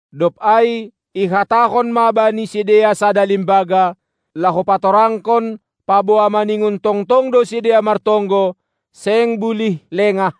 Dob ai ihatahon ma bani sidea sada limbaga, laho patorangkon paboa maningon tongtong do sidea martonggo, seng bulih lengah,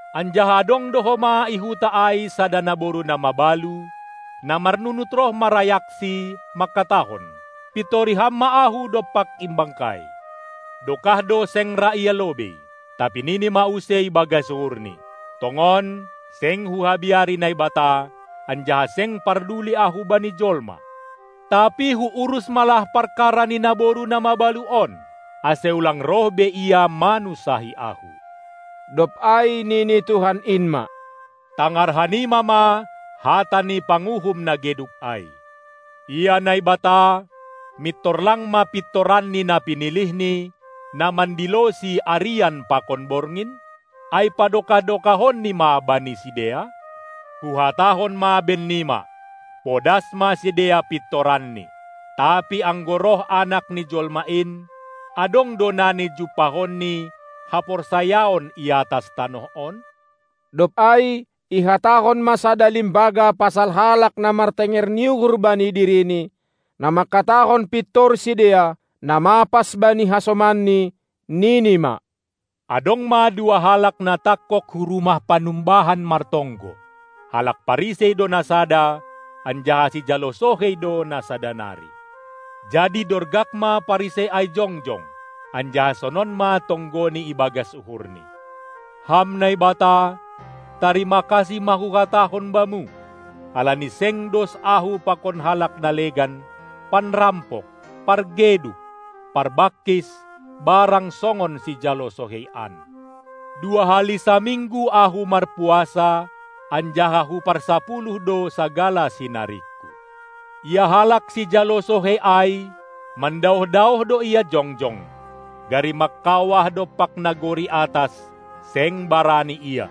Anjaha adong do homa i huta ai sada naboru na mabalu, na marnunut roh marayaksi, mangkatahon: Pintori ham ma ahu dompak imbangkai! Dokah do seng ra ia lobei. Tapi nini ma use ibagas uhurni: Tongon, seng huhabiari Naibata, anjaha seng parduli ahu bani jolma, tapi huurus ma lah parkara ni naboru na mabalu on, ase ulang roh be ia manunsahi ahu. Dob ai nini Tuhan in ma: Tangar hanima ma hata ni panguhum na geduk ai! Ia Naibata, mintor lang ma pintoranNi na pinilihNi, na mandiloSi arian pakon borngin? Ai padokah-dokahonNi ma bani sidea? Huhatahon ma bennima: Podas ma sidea pintoranNi! Tapi anggo roh Anak ni jolma in, adong do nani jumpahonNi haporsayaon i atas tanoh on? Dob ai ihatahon ma sada limbaga pasal halak na martenger ni uhur bani dirini, na mangkatahon pintor sidea, na mapas bani hasomanni, nini ma: Adong ma dua halak na tangkog hu rumah panumbahan martonggo, halak Parisei do na sada, anjaha sijalo sohei do na sada nari. Jadi dorgak ma Parisei ai jongjong, anjaha sonon ma tonggoni ibagas uhurni: Ham Naibata, tarima kasih ma huhatahon Bamu, halani seng dos ahu pakon halak na legan, panrampok, pargeduk, parbangkis barang songon sijalo sohei an. Dua hali saminggu ahu marpuasa, anjaha huparsapuluh do sagala sinaringku. Ia halak sijalo sohei ai mandaoh-daoh do ia jongjong, gari mangkawah dompak nagori atas seng barani ia.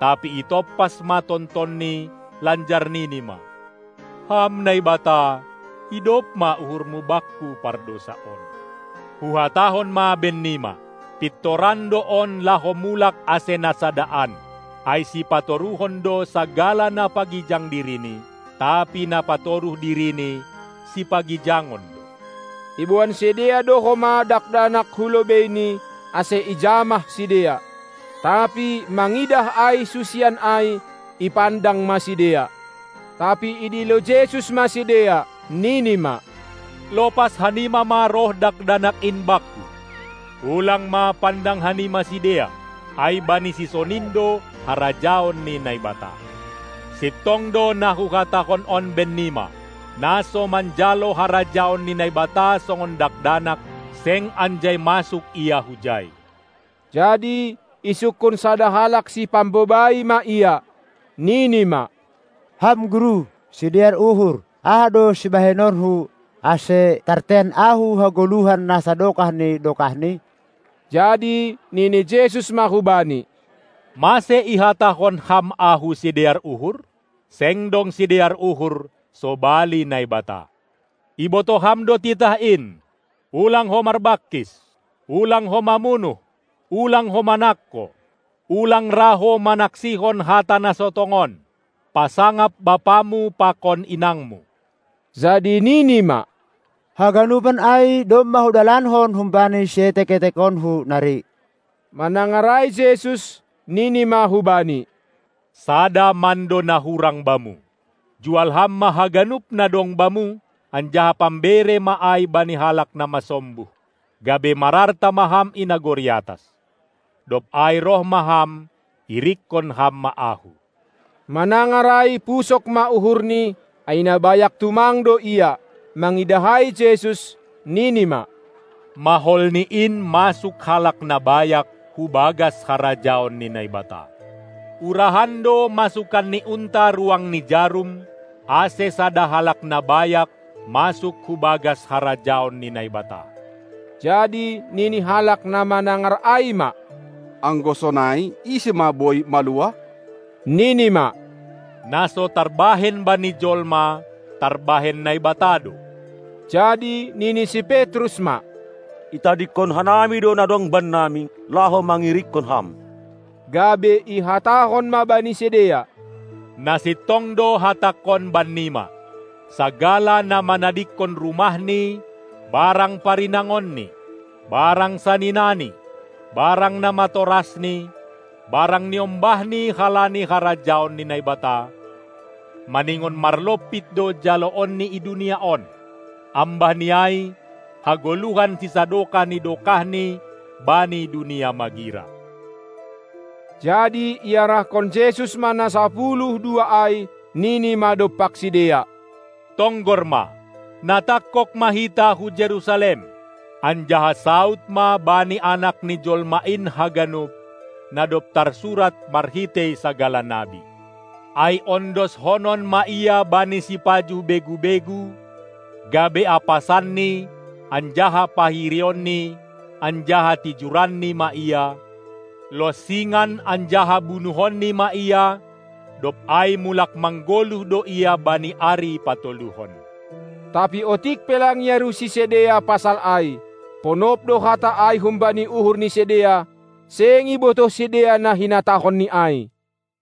Tapi itompas ma tontonni, lanjar nini ma: Ham Naibata, idop ma uhurmu bakku pardousa on! Huhatahon ma bennima: Pintoran do on laho mulak ase na sada an. Ai sipatoruhon do sagala na pagijang dirini, tapi na patoruh dirini sipagijangon do! Iboan sidea do homa dakdanak hu lobeiNi, ase ijamah sidea. Tapi mangidah ai susian ai, ipandang ma sidea. Tapi idilo Jesus ma sidea, Nini ma: Lopas hanima ma roh dakdanak in Bakku, ulang ma pandang hanima sidea, ai bani sisonin do harajaon ni Naibata! Sintong do na Huhatahon on bennima: Na so manjalo harajaon ni Naibata songon dakdanak, seng anjai masuk ia hujai. Jadi isungkun sada halak sipambobai ma Ia, nini ma: Ham Guru, sidear uhur, aha do sibahenonku, ase tartean ahu hagoluhan na sadokah ni dokahni? Jadi nini Jesus ma hubani: Mase ihatahon ham Ahu sidear uhur? Seng dong sidear uhur sobali Naibata. Ibotoh ham do titah in: Ulang ho marbangkis! Ulang ho mamunuh! Ulang ho manangko! Ulang ra ho manaksihon hata na so tongon! Pasangap bapamu pakon inangmu! Jadi nini ma: Haganupan ai domma hudalankon humbani sietek-etekonku nari. Manangar ai Jesus, Nini ma hubani: Sada mando na hurang bamu! Jual ham ma haganup na dong bamu, anjaha pambere ma ai bani halak na masombuh, gabe mararta ma ham i nagori atas. Dob ai roh ma ham, irikkon ham ma Ahu! Manangar ai pusok ma uhurni, ai na bayak tumang do ia. Mangidah ai Jesus, nini ma: Maholni in masuk halak na bayak hubagas harajaon ni Naibata! Urahan do masukan ni unta ruang ni jarum, ase sada halak na bayak masuk hubagas harajaon ni Naibata. Jadi nini halak na manangar ai ma: Anggo sonai, ise ma boi maluah? Nini ma: Na so tarbahen bani jolma, tarbahen Naibata do. Jadi nini si Petrus ma: Itadingkon hanami do na dong bannami, laho mangirikkon ham. Gabe ihatahon ma bani sidea: Na sintong do hatangKon bannima: Sagala na manadingkon rumahni barang parinangonni barang saninani barang namatorasni barang niombahni halani harajaon ni Naibata, maningon marlompit do jaloonni i dunia on, ambahni ai hagoluhan sisadokah ni dokahni bani dunia magira. Jadi iarahkon Jesus ma na sapuluh dua ai, nini ma dompak sidea: Tonggor ma, na tangkog ma hita hu Jerusalem, anjaha saud ma bani Anak ni joma in haganup, na dob tarsurat marhitei sagala nabi. Ai ondoshonon ma Ia bani sipajuh begu-begu, gabe apasanni anjaha pahirionni anjaha tijuranni ma Ia, lonsingan anjaha bunuhonni ma Ia, dob ai mulak manggoluh do Ia bani ari patoluhon. Tapi otik pe lang iarusi sidea pasal ai; ponop do hata ai humbani uhur ni sidea, seng ibotoh sidea na hinatahonNi ai.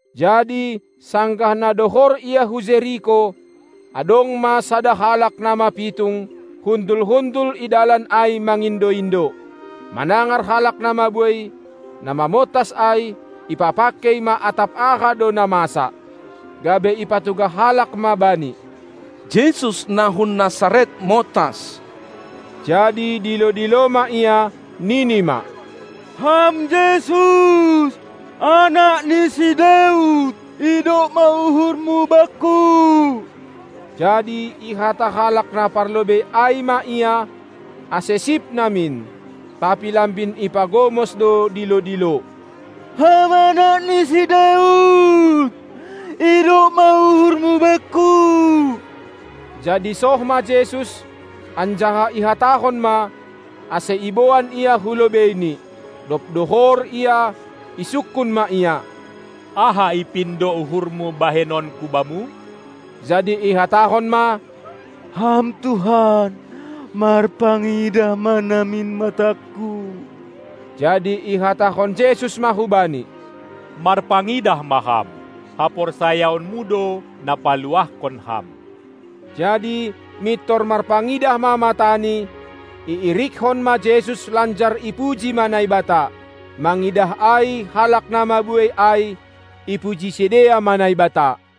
Jadi sanggah na dohor Ia hu Jeriko, adong ma sada halak na mapitung, hundul-hundul i dalan ai mangindo-indo. Manangar halak na mabuei, na mamontas ai, ipapangkei ma atap aha do na masa. Gabe ipatugah halak ma bani: Jesus na hun Nasaret montas. Jadi dilo-dilo ma ia, nini ma: Ham Jesus, Anak ni si Daud, idop ma uhurmu bakku! Jadi ihata halak na parlobei ai ma ia, ase sip namin. Tapi lambin ipagomos do dilo-dilo: Ham Anak ni si Daud, idop ma uhurmu bakku! Jadi soh ma Jesus, anjaha ihatahon ma, ase iboan ia hu lobeiNi. Dob dohor ia, isungkun ma ia: Aha ipindo uhurmu bahenonKu bamu? Jadi ihatahon ma: Ham Tuhan, marpangidah ma namin matangku! Jadi ihatahon Jesus ma hubani: Marpangidah ma ham! Haporsayaonmu do na paluahkon ham. Jadi mintor marpangidah ma matani, iirikkon ma Jesus lanjar ipuji ma Naibata. Mangidah ai halak na mabuei ai, ipuji sidea ma Naibata.